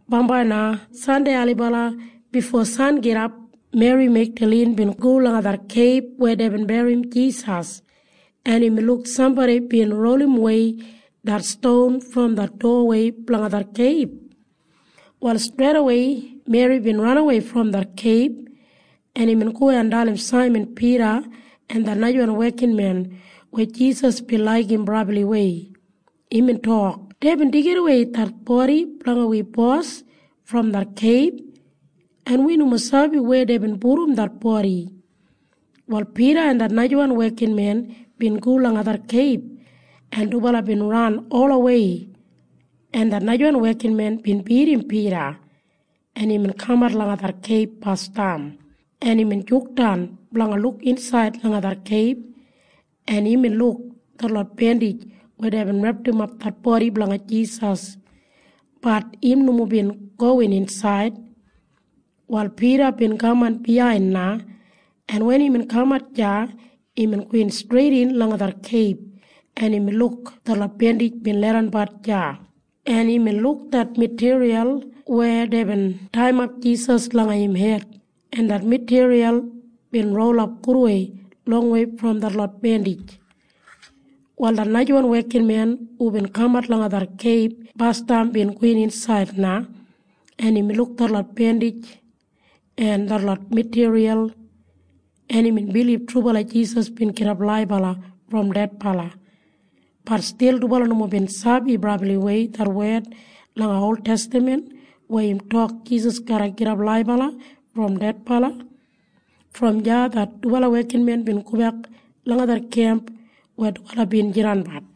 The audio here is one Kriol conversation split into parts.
Bambai na Sandei ailibala bifo sangidap Meri Megdalin bin go langa det keib weya deibin berrim Jisas, en imbin luk sambodi bin rolimwei det ston brom det dowawei blanga det keib. Wal streidawei Meri bin ranawei brom det keib, en imbin go en dalim Saiman Pida en det najawan wekinmen weya Jisas bin laigim brabliwei. Imbin tok, “Deibin deigidawei det bodi blanga wi Bos brom det keib, en wi nomo sabi weya deibin pudum det bodi.” Wal Pida en det najawan wekinmen bin go langa det keib, en dubala bin ran olawei, en det najawan wekinmen bin bidim Pida, en imbin kamat langa det keib basdam, en imbin jukdan blanga luk insaid langa det keib, en imbin luk detlot bendij weya deibin repdimap det bodi blanga Jisas. Bat im nomo bin gowin insaid. Wal Pida bin kaman biyain na, en wen imbin kamat deya, imbin gowin streidin langa det keib, en imbin luk detlot bendij bin leidanbat deya, en imbin luk det matiriyal weya deibin taiyimap Jisas langa im hed, en det matiriyal bin rolap gudwei longwei brom detlot bendij. Wal det najawan wekinmen hubin kamat langa det keib basdam bin gowin insaid na, en imbin luk detlot bendij en detlot matiriyal, en imbin bilib trubala Jisas bin gidap laibala brom dedbala. Bat stil dubala nomo bin sabi brabliwei det wed langa oltestaman weya tok Jisas garra gidap laibala brom dedbala. Brom deya det dubala wekinmen bin gobek langa det kemp weya dubala bin jidanbat.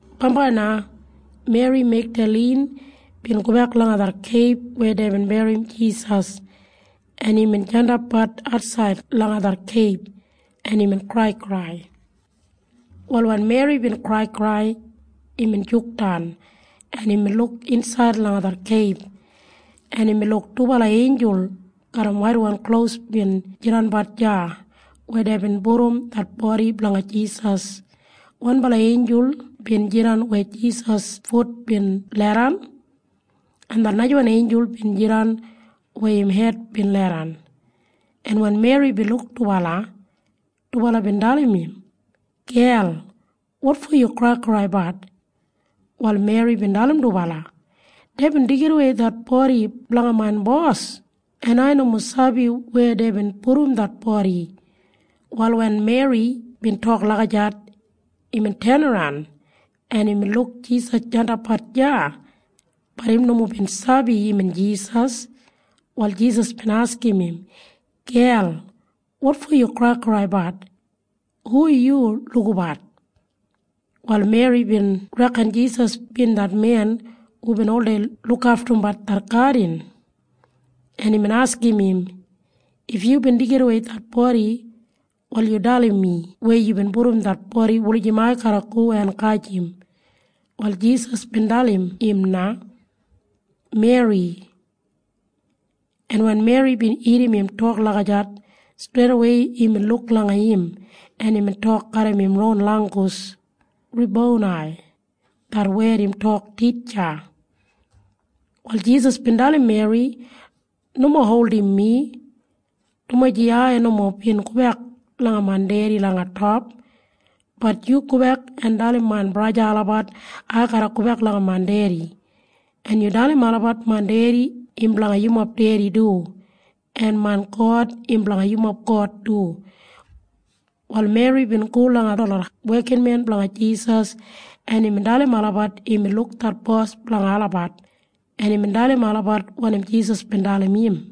Bambai na Meri Megdalin bin gobek langa det keib weya deibin berrim Jisas, en imbin jandapbat atsaid langa det keib, en imbin kraikrai. Wal wen Meri bin kraikrai, imbin jukdan, en imbin luk insaid langa det keib, en imbin luk dubala einjul garram waitwan klos bin jidanbat deya weya deibin pudum det bodi blanga Jisas. Wanbala einjul bin jidan weya Jisas fut bin leidan, en det najawan einjul bin jidan weya im hed bin leidan. En wen Meri bin luk dubala, dubala bin dalim im, “Gel, wotfo yu kraikraibat?” Wal Meri bin dalim dubala, “Deibin deigidawei det bodi blanga main Bos, en ai nomo sabi weya deibin pudum det bodi.” Wal wen Meri bin tok lagijat, imbin tenaran, en imbin luk Jisas jandapbat deya. Bat im nomo bin sabi imbin Jisas. Wal Jisas bin askim im, “Gel, wotfo yu kraikraibat? Hu yu lukabat?” Wal Meri bin reken Jisas bin det men hubin oldei lukaftumbat det gadin, en imbin askim im, “If yubin deigidawei det bodi, wal yu dalim mi weya yubin pudum det bodi wulijim ai garra go en gajim.” Wal Jisas bin dalim im na, “Meri.” En wen Meri bin irrim im tok lagijat, streidawei imbin luk langa im, en imbin tok garram im ron langgus, “Rebonai!” Det wed im tok Titja. Wal Jisas bin dalim Meri, “Nomo holdim mi, dumaji ai nomo bin gobek langa main Dedi langa top. Bat yu gobek en dalim main braja en sista olabat ai garra gobek langa main Dedi. En yu dalim olabat main Dedi im blanga yumob Dedi du, en main God im blanga yumob God du.” Wal Meri bin go langa detlot wekinmen blanga Jisas, en imbin dalim olabat imbin luk det Bos blanga olabat, en imbin dalim olabat wanim Jisas bin dalim im.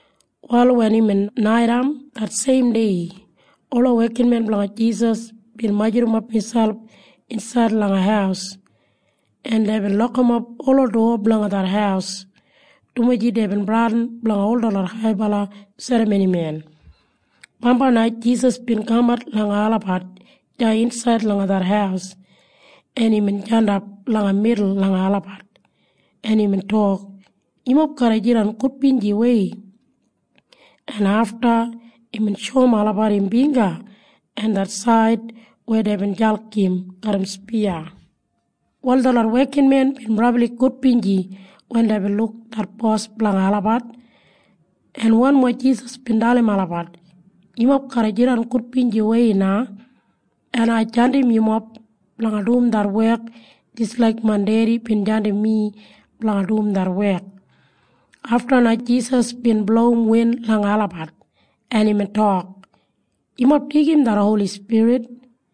Wal wen imbin naitaim det seimdei, ola wekinmen blanga Jisas bin majurrumap miselp insaid langa haus, en deibin lokimap ola dowa blanga det haus, dumaji deibin bradin blanga ol detlot haibala serramonimen. Bambai na Jisas bin kamat langa olabat deya insaid langa det haus, en imbin jandap langa midul langa olabat, en imbin tok, “Yumob garra jidan gudbinjiwei.” En afta imbin shoum olabat im bingga en det said weya deibin jalk im garram spiya. Wal detlot wekinmen bin brabli gudbinji wen deibin luk det Bos blanga olabat, en wanmo Jisas bin dalim olabat, “Yumob garra jidan gudbinjiwei na. En ai jandim yumob blanga dum det wek jis laik main Dedi bin jandim mi blanga dum det wek.” Afta na Jisas bin blowim win langa olabat, en imbin tok, “Yumob deigim det Holi Spirit.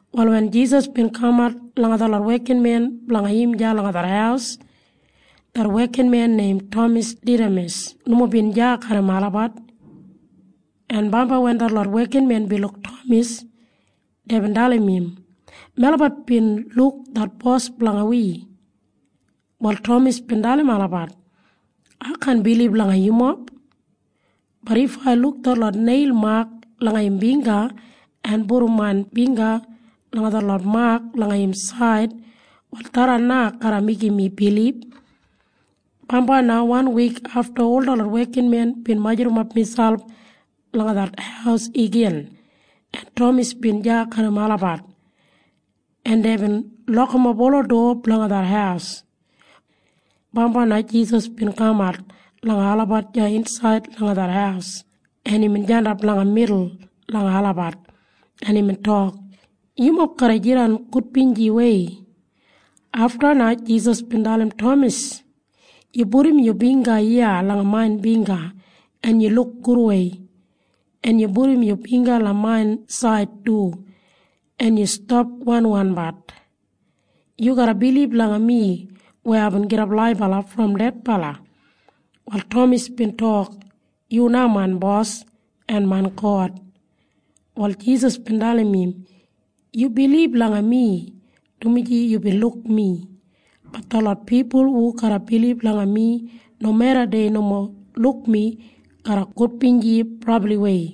Wal wen Jisas bin kamat langa detlot wekinmen blanga im deya langa det haus, det wekinmen neim Tamas Didamas nomo bin deya garram olabat, en bambai wen detlot wekinmen bin luk Tamas, deibin dalim im, “Melabat bin luk det Bos blanga wi.” Wal Tamas bin dalim olabat, “Ai kaan bilib langa yumob. Bat if ai luk detlot neil mak langa im bingga en pudum main bingga langa detlot mak langa im said, wal tharran na garra meigim mi bilib.” Bambai na wan wik afta ol detlot wekinmen bin majurrumap miselp langa det haus igin, en Tamas bin deya garram olabat, en deibin lokimap ola dowa blanga det haus. Bambai na Jisas bin kamat langa olabat deya insaid langa det haus, en imbin jandap langa midul langa olabat, en imbin tok, “Yumob garra jidan gudbinjiwei.” Afta na Jisas bin dalim Tamas, “Yu pudum yu bingga iya langa main bingga en yu luk gudwei. En yu pudum yu bingga langa main said du. En yu stap askimbat oldei. Yu garra bilib langa mi weya aibin gidap laibala brom dedbala.” Wal Tamas bin tok, “Yu na main Bos en main God!” Wal Jisas bin dalim im, “Yu bilib langa mi dumaji yubin luk mi. Bat detlot pipul hu garra bilib langa mi nomeda dei nomo luk mi garra gudbinji brabliwei.”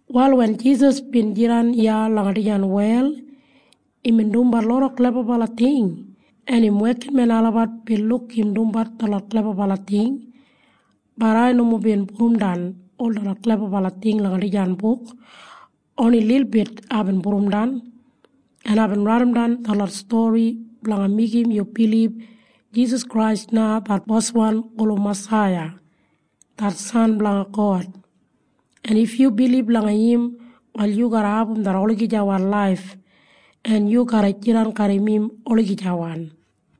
Wal wen Jisas bin jidan iya langa dijan wel, imbin dumbat loda klebabala ting, en im wekinmen olabat bin luk im dumbat detlot klebabala ting. Bat ai nomo bin pudumdan ol detlot klebabala ting langa dijan buk. Oni lilbit aibin pudumdan. En aibin raidimdan detlot stori blanga meigim yu bilib Jisas Krais na det Boswan gulum Masaiya, det San blanga God. En if yu bilib langa im, wal yu garra abum det olagijawan laif, en yu garra jidan garram im olagijawan.